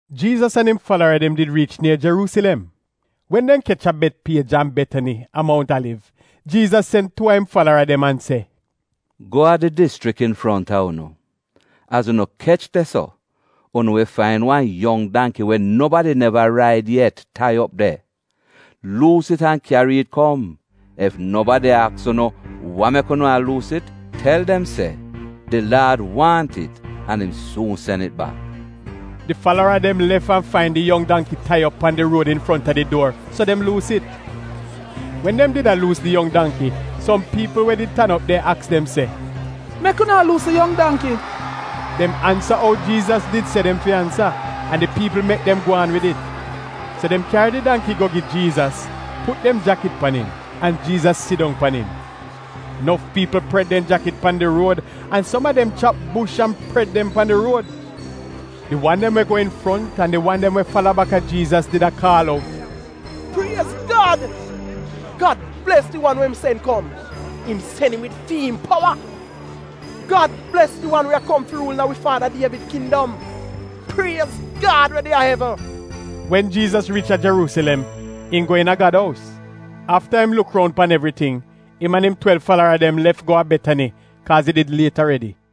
Jiizas an im falara dem did riich nier Jeruusilem. Wen dem kech a Betpiej an Betani a Mount Aliv, Jiizas sen tuu a im falara dem an se, “Go a di dischrik infronta unu. Az unu kech de-so, unu wi fain wan yong dangki we nobadi neva raid yet tai op de. Luus it an kyari it kom. Ef nobadi aks unu ‘Wa mek unu a luus it?’ tel dem se, ‘Di Laad waahn it an im suun sen it bak.’” Di falara dem lef an fain di yong dangki tai op pan di ruod infronta di duor, so dem luus it. Wen dem did a luus di yong dangki, som piipl we did tan op de aks dem se, “Mek unu a luus di yong dangki?” Dem ansa ou Jiizas did se dem fi ansa, an di piipl mek dem gwaan wid it. So dem kyari di dangki go gi Jiizas, put dem jakit pan it an Jiizas sidong pan im. Nof piipl pred dem jakit pan di ruod, an som a dem chap bush an pred dem pan di ruod. Di wan dem we go infront an di wan dem we fala baka Jiizas did a kaal out, “Priez Gad!” “Gad bles di wan we im sen kom, im sen im wid fi'im powa!” “Gad bles di wan we a kom fi ruul iina wi Faada Dievid kindom!” “Priez Gad we de a evn!” Wen Jiizas riich a Jeruusilem, im go iina Gad ous. Afta im luk roun pan evriting, im an im twelv falara dem lef go a Betani kaaz it did liet aredi.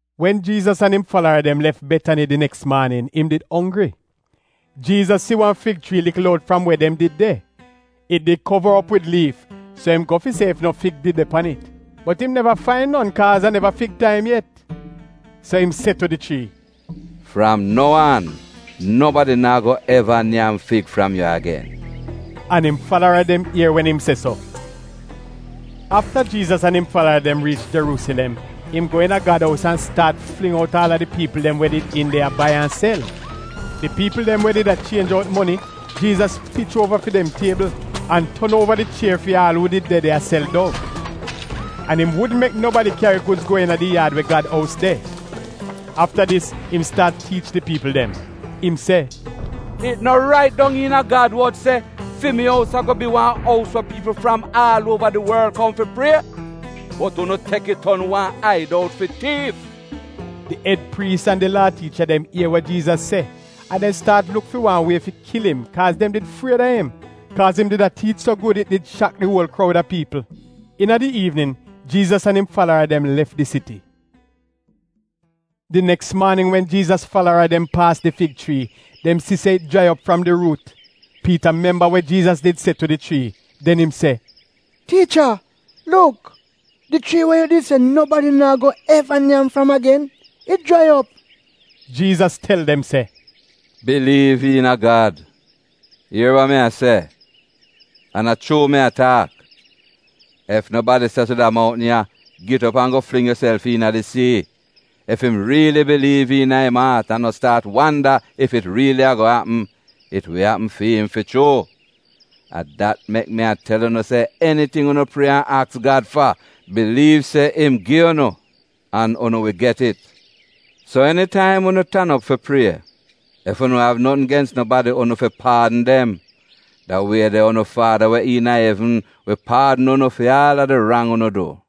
Wen Jiizas an im falara dem lef Betani di neks maanin, im did onggri. Jiizas si wan fig chrii likl out fram we dem did de. It did kova op wid liif, so im go fi si ef no fig de pan it. Bot im neva fain non kaaz a neva fig taim yet. So im se tu di chrii, “Fram nou aan nobadi naa go eva nyam fig fram yu agen!” An im falara dem ier wen im se so. Afta Jiizas an im falara dem riich Jeruusilem, im go iina Gad ous an staat fling out aal a di piipl dem we did iin de a bai an sel. Di piipl dem we did a chienj out moni, Jiizas pich uova fi dem tiebl an ton uova di chier fi aal uu did de de a sel dov. An im wudn mek nobadi kyari gudz go iina di yaad we Gad ous de. Afta dis im staat tiich di piipl dem. Im se, “It no rait dong iina Gad wod se: “ ‘Fi mi ous ago bi wan ous we piipl fram aal uova di worl kom fi prie’? Bot unu tek it ton ‘wan aid out fi tiif!’” Di ed priis an di Laa tiicha dem ier wa Jiizas se, an dem staat luk fi wan wie fi kil im, kaaz dem did fried a im, kaaz im did a tiich so gud it did shak di uol kroud a piipl. Iina di iivnin Jiizas an im falara dem lef di siti. Di neks maanin wen Jiizas falara dem paas di fig chrii dem si se it jrai op fram di ruut. Piita memba wa Jiizas did se tu di chrii. Den im se, “Tiicha, luk! Di chrii we yu did se nobadi naa go eva nyam fram agen, it jrai op!” Jiizas tel dem se, “Biliiv iina Gad! Ier wa mi a se, an a chuu mi a taak, ef nobadi se tu da mountn ya, ‘Git op an go fling yuself iina di sii,’ ef im riili biliiv iina im aat an no staat wanda ef it riili ago apm, it wi apm fi'im fi chuu. A dat mek mi a tel unu se eniting unu prie an aks Gad fa, biliiv se im gi unu, an unu wi get it. So enitaim unu tan op fi prie, ef unu av notn gens nobadi unu fi paadn dem. Da wie de unu faada we iina evn wi paadn unu fi aal a di rang unu du.”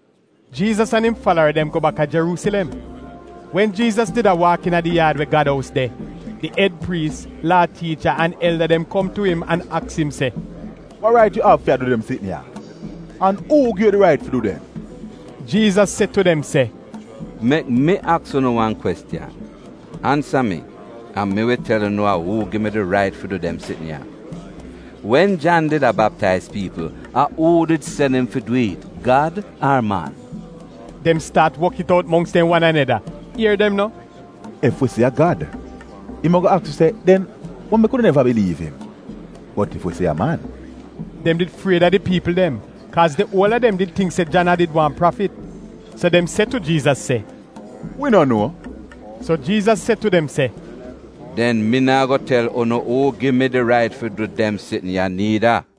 Jiizas an im falara dem go bak a Jeruusilem. Wen Jiizas did a waak iina di yaad we Gad ous de, de ed priis, Laa tiicha an elda dem kom tu im an aks im se, “Wa rait yu av fi a du dem sitn ya? An uu gi yu di rait fi du dem?” Jiizas se tu dem se, “Mek mi aks unu wan kwestiyan. Ansa mi an mi wi tel unu a uu gi mi di rait fi du dem sitn ya. Wen Jan did a baptaiz piipl, a uu did sen im fi dwi'it, Gad ar man?” Dem staat wok it out mongks dem wan aneda. Ier dem no, “Ef wi se a Gad, im ago aks wi se, ‘Den wa mek unu neva biliiv im.’ Bot ef wi se ‘A man’.” (Dem did fried a di piipl dem, kaaz di uola dem did tingk se Jan a did wan prafit.) So dem se tu Jiizas se, “Wi no nuo.” So Jiizas se tu dem se, “Den mi naa go tel unu uu gi mi di rait fi du dem sitn ya niida.”